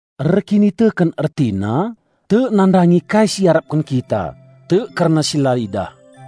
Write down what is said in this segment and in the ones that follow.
Erkiniteken ertina tek nandangi kai si iarapken kita, tek kerna si la idah.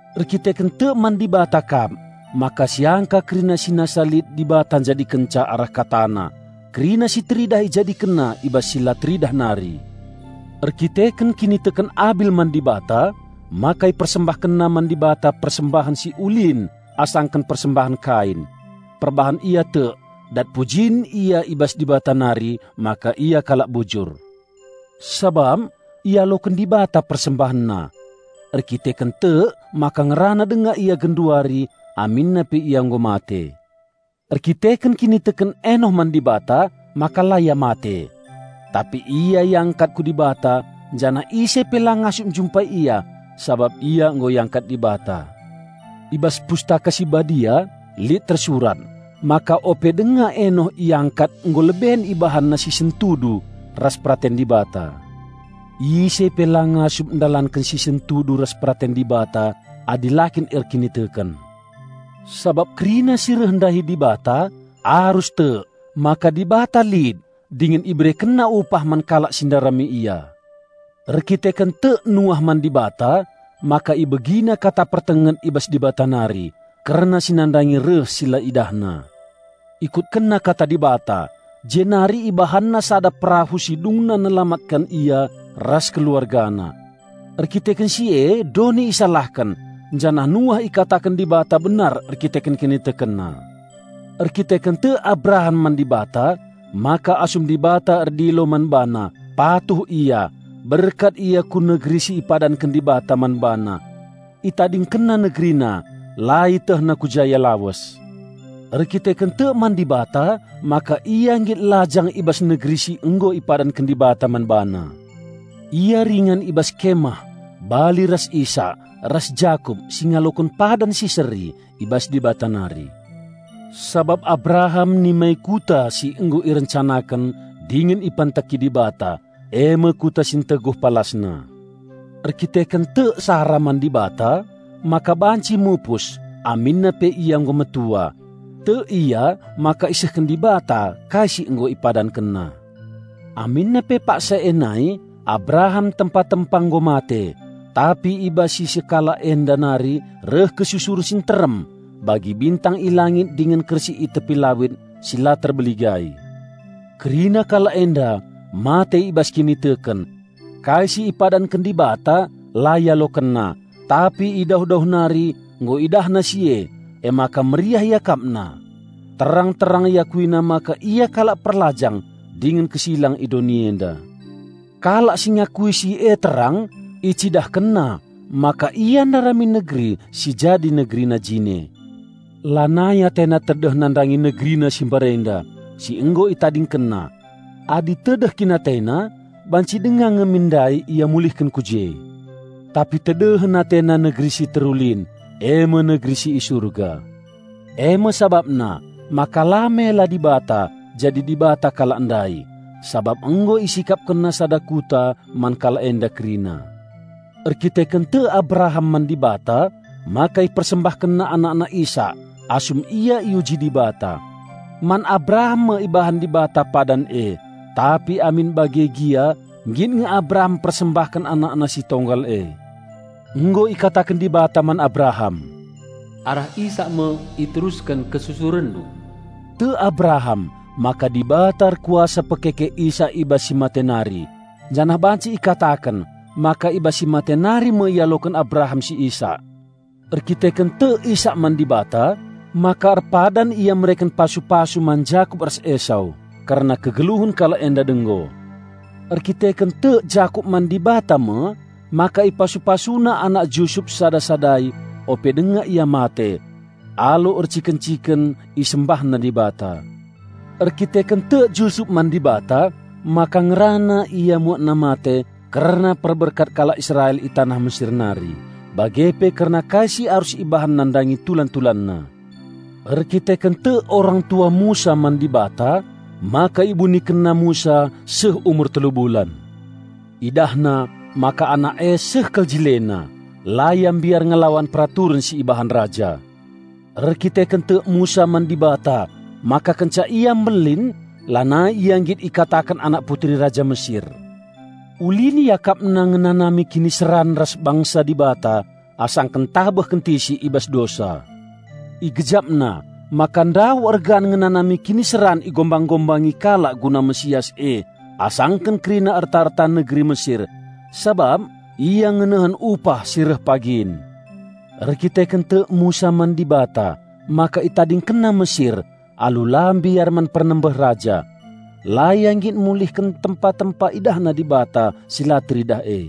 Erdandanken tek man Dibata kap maka siangka kerina si nasa lit Dibata njadikenca arah KataNa; kerina si teridah IjadikenNa i bas si la teridah nari. Erdandanken kiniteken Abil man Dibata maka ipersembahkenna man Dibata persembahen si ulin asangken persembahen Kain. Perbahan ia tek, dat pujin ia i bas Dibata nari maka ia kalak bujur, sabap ialoken Dibata persembahenna. Erdandanken tek maka ngerana denga ia genduari aminna pe ia nggo mate. Erdandanken kiniteken Enoh man Dibata maka la ia mate. Tapi ia iangkat ku Dibata, janah ise pe la ngasup njumpai ia, sabap ia nggo iangkat Dibata. I bas Pustaka Si Badia lit tersurat maka ope denga Enoh iangkat nggo leben ibahanna si sentudu ras peraten Dibata. Ise pe la ngasup ndalanken si sentudu ras peraten Dibata adi la kin erkiniteken. Sabap kerina si reh ndahi Dibata arus tek maka Dibata lit dingen IberekenNa upah man kalak si ndarami Ia. Erdandanken tek Nuah man Dibata maka ibegina kata pertenget i bas Dibata nari, kerna si nandangi reh si la idahna. Ikutkenna kata Dibata, jenari ibahanna sada perahu si dungna nelamatken ia ras keluargana. Erkiteken si e doni isalahken, janah Nuah ikataken Dibata benar erkiteken kinitekenna. Erdandanken tek Abraham man Dibata maka asum Dibata erdilo man bana, patuh ia, berkat ia ku negeri si ipadanken Dibata man bana. Itadingkenna negerina la ietehna ku ja ia lawes. Erdandanken tek man Dibata maka ia nggit lajang i bas negeri si nggo ipadanken Dibata man bana. Ia ringan i bas kemah bali ras Isak ras Jakup si ngaloken padan si seri i bas Dibata nari. Sabap Abraham nimai kuta si nggo irencanaken dingen ipanteki Dibata, e me kuta si nteguh palasna. Erdandanken tek Sara man Dibata maka banci mupus aminna pe ia nggo metua. Tek ia maka isehken Dibata kai si nggo IpadankenNa. Aminna pe paksa e nai Abraham tempa-tempa nggo mate, tapi i bas si sekalak enda nari reh kesusuren si nterem bagi bintang i langit dingen kersik i tepi lawit si la terbeligai. Kerina kalak enda mate i bas kiniteken. Kai si ipadanken Dibata la ialokenna, tapi i dauh-dauh nari nggo idahna si e, emaka meriah iakapna. Terang-terang iakuina maka ia kalak perlajang dingen kesilang i doni enda. Kalak si ngakui si e terang icidahkenna maka ia ndarami negeri si jadi negerina jine. Lanai atena tedeh nandangi negerina si mbarenda si nggo itadingkenna. Adi tedeh kin atena banci denga nge min ndai ia mulihken ku je. Tapi tedehen atena negeri si terulin, e me negeri si i Surga. E me sabapna maka la mela Dibata jadi Dibata kalak ndai, sabap nggo IsikapkenNa sada kuta man kalak enda kerina. Erdandanken tek Abraham man Dibata maka ipersembahkenna anakna Isak, asum ia iuji Dibata. Man Abraham me ibahan Dibata padan e, tapi amin bage gia nggit nge Abraham mpersembahken anakna si tonggal e. Nggo ikataken Dibata man Abraham, "Arah Isak me iterusken kesusurenndu." Tek Abraham maka Dibata erkuasa pekeke Isak i bas si mate nari; janah banci ikataken maka i bas si mate nari me ialoken Abraham si Isak. Erdandanken tek Isak man Dibata maka erpadan ia mereken pasu-pasu man Jakup ras Esau kerna kegeluhen kalak enda denggo. Erdandanken tek Jakup man Dibata me maka ipasu-pasuna anak Jusup sada-sadai ope denga ia mate. Alu erciken-ciken isembahna Dibata. Erdandanken tek Jusup man Dibata maka ngerana ia muatna mate kerna perberkat kalak Israel i taneh Mesir nari bage pe kerna kai si arus ibahan nandangi tulan-tulanna. Erdandanken tek orang tua Musa man Dibata maka ibunikenna Musa seh umur telu bulan. Idahna maka anak e seh kal jilena, la ia mbiar ngelawan peraturen si ibahan raja. Erdandanken tek Musa man Dibata maka kenca ia mbelin lanai ia nggit ikataken anak Putri Raja Mesir. Ulin iakapna ngenanami kiniseran ras bangsa Dibata asangken ntabeh kentisik i bas dosa. Igejapna maka ndauh ergan ngenanami kiniseran igombang-gombangi kalak guna Mesias e asangken kerina erta-erta negeri Mesir, sabap ia ngenehen upah si reh pagin. Erdandanken tek Musa man Dibata maka itadingkenna Mesir alu la mbiar man pernembeh raja. La ia nggit mulihken tempa-tempa idahna Dibata si la teridah e.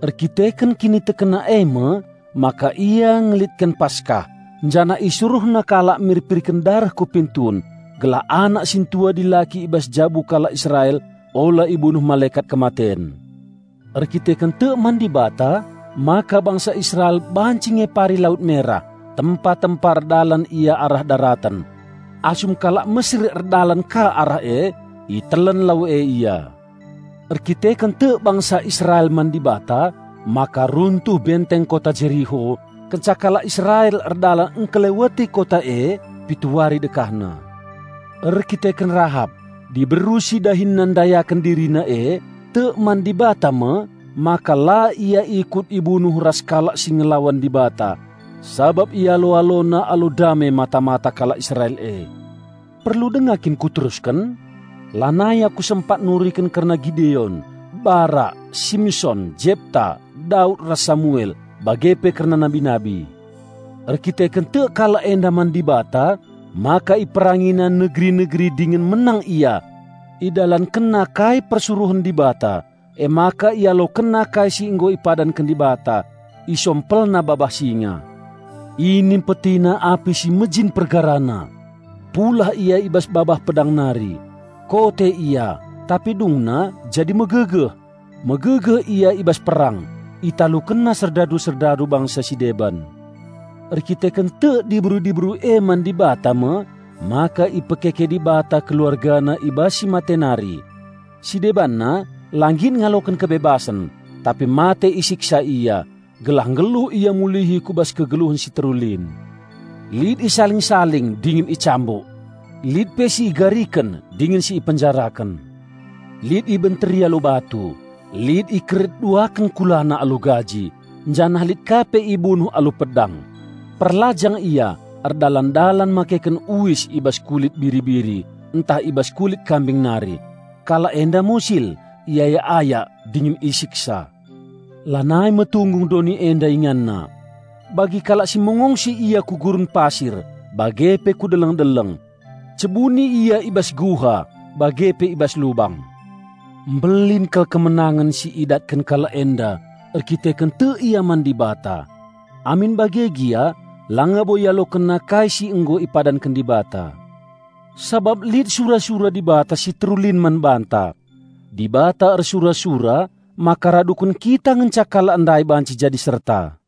Erdandanken kinitekenna e me maka ia ngelitken Paskah, janah isuruhna kalak mirpirken dareh ku pintun, gelah anak sintua dilaki i bas jabu kalak Israel ula ibunuh Malekat Kematen. Erdandanken tek man Dibata maka bangsa Israel banci ngepari Lawit Merah, tempa-tempa erdalan ia arah daraten. Asum kalak Mesir erdalan ka arah e, itelen lau e ia. Erdandanken tek bangsa Israel man Dibata maka runtuh benteng kota Jeriho kenca kalak Israel erdalan engkeleweti kota e pitu wari dekahna. Erdandanken Rahap, diberu si dahinna ndayaken dirina e, tek man Dibata me maka la ia ikut ibunuh ras kalak si ngelawan Dibata, sabap ialo-alona alu dame mata-mata kalak Israel e. Perlu denga kin kuterusken? Lanai aku sempat nuriken kerna Gideon, Barak, Simson, Jepta, Daud ras Samuel, bage pe kerna nabi-nabi. Erdandanken tek kalak enda man Dibata maka iperangina negeri-negeri dingen menang ia. Idalankenna kai persuruhen Dibata, emaka ialokenna kai si nggo ipadanken Dibata. Isompelna babah singa. Inimpetina api si mejin pergarana. Pulah ia i bas babah pedang nari. Kote ia, tapi dungna jadi megegeh. Megegeh ia i bas perang. Italukenna serdadu-serdadu bangsa si deban. Erdandanken tek diberu-diberu e man Dibata me maka ipekeke Dibata keluargana i bas si mate nari. Si debanna la nggit ngaloken kebebasen, tapi mate isiksa ia, gelah nggeluh ia mulihi ku bas kegeluhen si terulin. Lit isaling-saling dingen icambuk. Lit pe si igariken dingen si ipenjaraken. Lit ibenteri alu batu, lit ikeret duaken kulana alu gaji, janah lit ka pe ibunuh alu pedang. Perlajang ia erdalan-dalan makeken uis i bas kulit biri-biri ntah i bas kulit kambing nari; kalak enda musil, iayak-ayak, dingen isiksa. Lanai metunggung doni enda inganna! Bagi kalak si mengongsi ia ku gurun pasir bage pe ku deleng-deleng. Cebuni ia i bas guha bage pe i bas lubang. Mbelin kal kemenangen si idatken kalak enda erdandanken tek ia man Dibata. Amin bage gia langa bo ialokenna kai si nggo ipadanken Dibata. Sabap lit sura-sura Dibata si terulin man banta. Dibata ersura-sura maka raduken kita ngenca kalak ndai banci jadi serta.